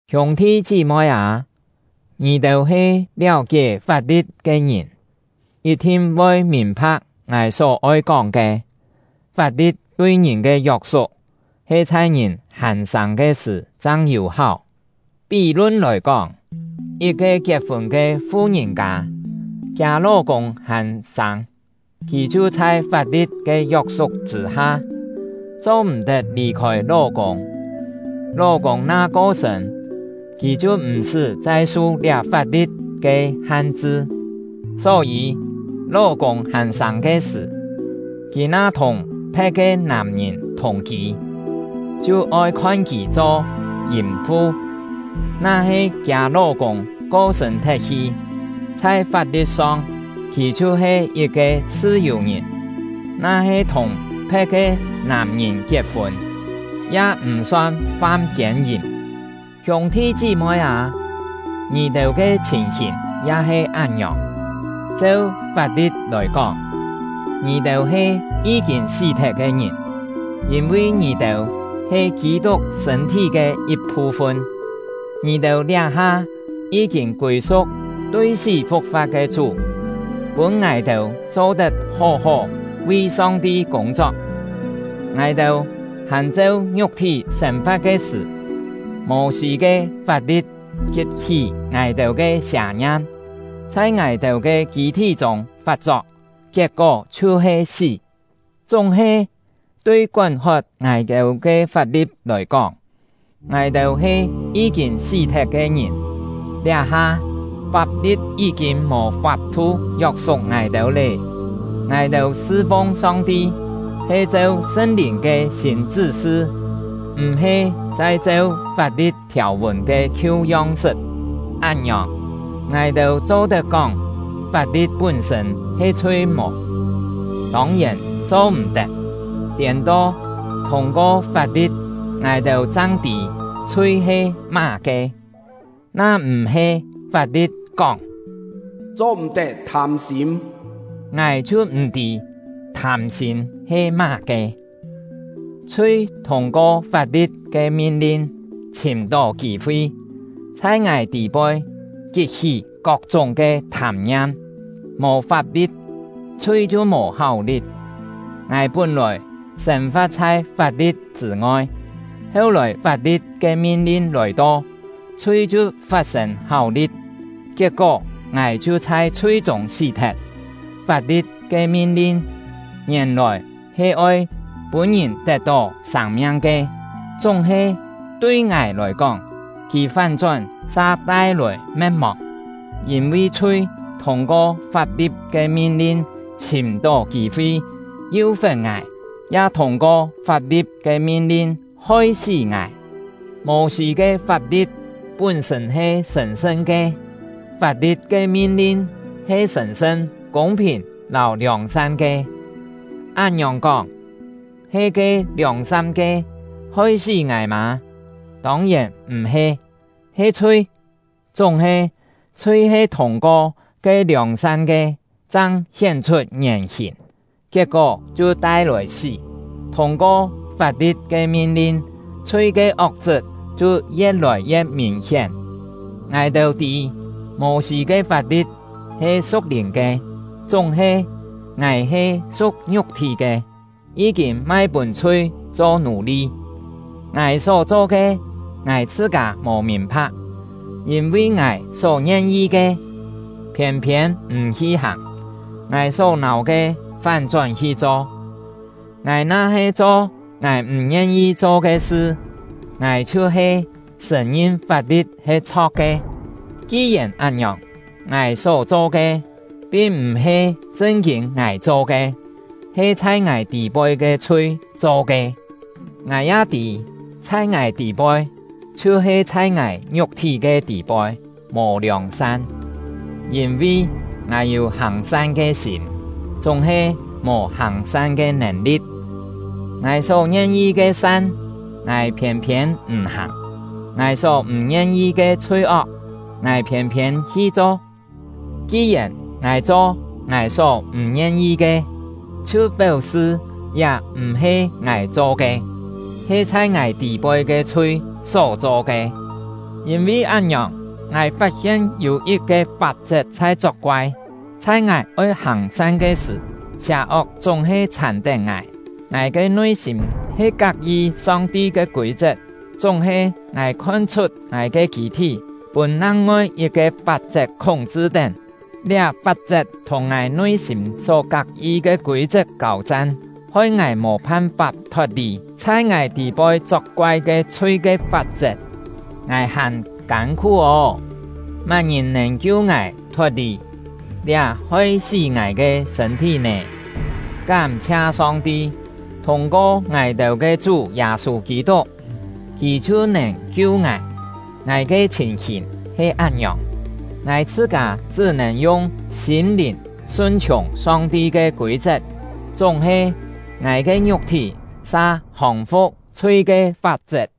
Hiûng-thi chí-moi â, ngì-têu he liáu-kié fap-li̍t ke ngìn, yit-thin voi mìn-pha̍k ngài só oi kóng ke: Fap-li̍t tui ngìn ke yok-suk, he chhai ngìn hàn sâng ke sṳ̀ chang yû-háu. Pí-lun lòi kóng, yit-ke kiet-fûn ke fu-ngìn-kâ, kiâ ló-kûng hàn sâng, kì chhiu chhai fap-li̍t ke yok-suk chṳ̂-ha, cho-m̀-tet lì-khôi ló-kûng; ló-kûng na ko-sṳ̂n, kì chhiu m̀-sṳ́ chai su liá fap-li̍t ke han-chṳ. Só-yî, ló-kûng hàn sâng ke sṳ̀, kì na thùng phe̍t ke nàm-ngìn thùng-kî, chhiu oi khon kì cho yìm-fu. Na-he kiâ ló-kûng ko-sṳ̂n thet-hi, chhai fap-li̍t-song kì chhiu-he yit-ke chhṳ-yù-ngìn, na-he thùng phe̍t ke nàm-ngìn kiet-fûn, ya m̀ son fam kiên-yìm. Hiûng-thi chí-moi â, ngì-têu ke chhìn-hìn ya he án-ngiòng. Cheu fap-li̍t lòi kóng, ngì-têu he yí-kîn sí-thet ke ngìn, yîn-vi ngì-têu he Kî-tuk sṳ̂n-thí ke yit-phu-fun; ngì-têu liá-ha yí-kîn kûi-su̍k tui sí fu̍k-fa̍t ke Chú, pûn ngài-têu cho-tet hó-hó vi Song-ti kûng-chok. Ngài-têu hàn cheu ngiuk-thí sên-fa̍t ke sṳ̀, Mô-sî ke fap-li̍t kit-hí ngài-têu ke sià-ngiam, chhai ngài-têu ke kî-thí chûng fat-chok, kiet-kó chhiu-he sí. Chúng-he, tui kón-hot ngài-têu ke fap-li̍t lòi kóng, ngài-têu he yí-kîn sí-thet ke ngìn; liá-ha, fap-li̍t yí-kîn mò fap-thu yok-suk ngài-têu lé. Ngài-têu sṳ-fung Song-ti he cheu Sṳn-Lìn ke sîn chṳ́-sṳ, m̀-he chai cheu fap-li̍t thiàu-vùn ke khiu yong-sṳt. Án-ngiòng, ngài-têu cho-tet kóng fap-li̍t pún-sṳ̂n he chhui mò? Tông-yèn cho-m̀-tet! Tiên-to, thûng-ko fap-li̍t, ngài chang tî chhui he má-ke. Na m̀-he fap-li̍t kóng “Cho-m̀-tet thâm-sîm”, ngài chhiu m̀ tî thâm-sîm he má-ke. Chhui thûng-ko fap-li̍t ke min-lin chhìm-tó kî-fi, chhai ngài tî-poi kit-hí kok-chúng ke thâm-ngiam. Mò fap-li̍t, chhui chhiu mò háu-li̍t. Ngài pún-lòi sên-fa̍t chhai fap-li̍t chṳ̂ ngoi; heu-lòi fap-li̍t ke min-lin lòi-to, chhui chhiu fat-sên háu-li̍t, kiet-kó ngài chhiu chhai chhui-chûng sí-thet. Fap-li̍t ke min-lin ngièn-lòi he oi pûn ngìn tet-tó sâng-miang ke; chúng-he, tui ngài lòi kóng, kì fán-chón sa tai-lòi me̍t-mòng. Yîn-vi chhui thûng-ko fap-li̍t ke min-lin chhìm-tó kî-fi yú-fe̍t ngài, ya thûng-ko fap-li̍t ke min-lin hoi-sí ngài. Mô-sî ke fap-li̍t pún-sṳ̂n he sṳ̀n-sṳn ke; fap-li̍t ke min-lin he sṳ̀n-sṳn, kûng-phìn lâu liòng-san ke. Án-ngiòng kóng, he ke liòng-san ke hoi-sí ngài mâ? Tông-yèn m̀-he! He chhui! Chúng-he, chhui he thûng-ko ke liòng-san ke chang hién-chhut ngièn-hìn, kiet-kó chhiu tai-lòi sí. Thûng-ko fap-li̍t ke min-lin, chhui ke ok-chṳt chhiu ye̍t-lòi ye̍t mìn-hién. Ngài-têu tî, Mô-sî ke fap-li̍t he su̍k-lìn ke; chúng-he, ngài he su̍k ngiuk-thí ke, yí-kîn mai pûn chhui cho nù-li. Ngài só-cho ke, ngài chhṳ-kâ mò mìn-pha̍k: Yîn-vi ngài só ngien-yi ke, phiên-phiên m̀ hi hàng; ngài só-nâu ke, fán-chón hi cho. Ngài na-he cho ngài m̀ ngien-yi cho ke sṳ, ngài chhiu-he sṳ̀n-ngin fap-li̍t he chho̍k ke. Ki-yèn án-ngiòng, ngài só-cho ke, pin m̀-he chṳn-kîn ngài cho ke, he chhai ngài tî-poi ke chhui cho ke. Ngài ya tî, chhai ngài tî-poi, chhiu-he chhai ngài ngiuk-thí ke tî-poi, mò liòng-san. Yîn-vi, ngài yû hàng-san ke sîm, chúng-he mò hàng-san ke nèn-li̍t. Ngài só ngien-yi ke san, ngài phiên-phiên m̀ hàng; ngài só m̀ ngien-yi ke chhui-ok, ngài phiên-phiên hi cho. Ki-yèn ngài cho ngài só m̀ ngien-yi ke, chhiu péu-sṳ liá m̀-he ngài cho ke, he chhai ngài tî-poi ke chhui só-cho ke. Yîn-vi án-ngiòng, ngài fat-hien yû yit-ke fap-chet chhai chok-koai: Chhai ngài oi hàng-san ke sṳ̀, sià-ok chúng-he chhàn-tén ngài. Ngài ke nui-sîm he kak-yi Song-ti ke kûi-chet; chúng-he, ngài khon-chhut ngài ke kî-thí pûn nang-ngoi yit-ke fap-chet khúng-chṳ-tén; liá fap-chet thùng ngài nui-sîm só kak-yi ke kûi-chet kâu-chan, hoi ngài mò phan-fap thot-lì chhai ngài tî-poi chok-koai ke chhui ke fap-chet. Ngài hàn kân-khú ô! Má-ngìn nèn kiu ngài thot-lì liá hoi-sí ngài ke sṳ̂n-thí nè? Kám-chhia Song-ti, thûng-ko ngài-têu ke Chú Yâ-sû Kî-tuk, Kì chhiu nèn kiu ngài. Ngài ke chhìn-hìn he án-ngiòng: Ngài chhṳ-kâ chṳ́ nèn yung sîm-lìn sun-chhiùng Song-ti ke kûi-chet; chúng-he, ngài ke ngiuk-thí sa hòng-fu̍k chhui ke fap-chet.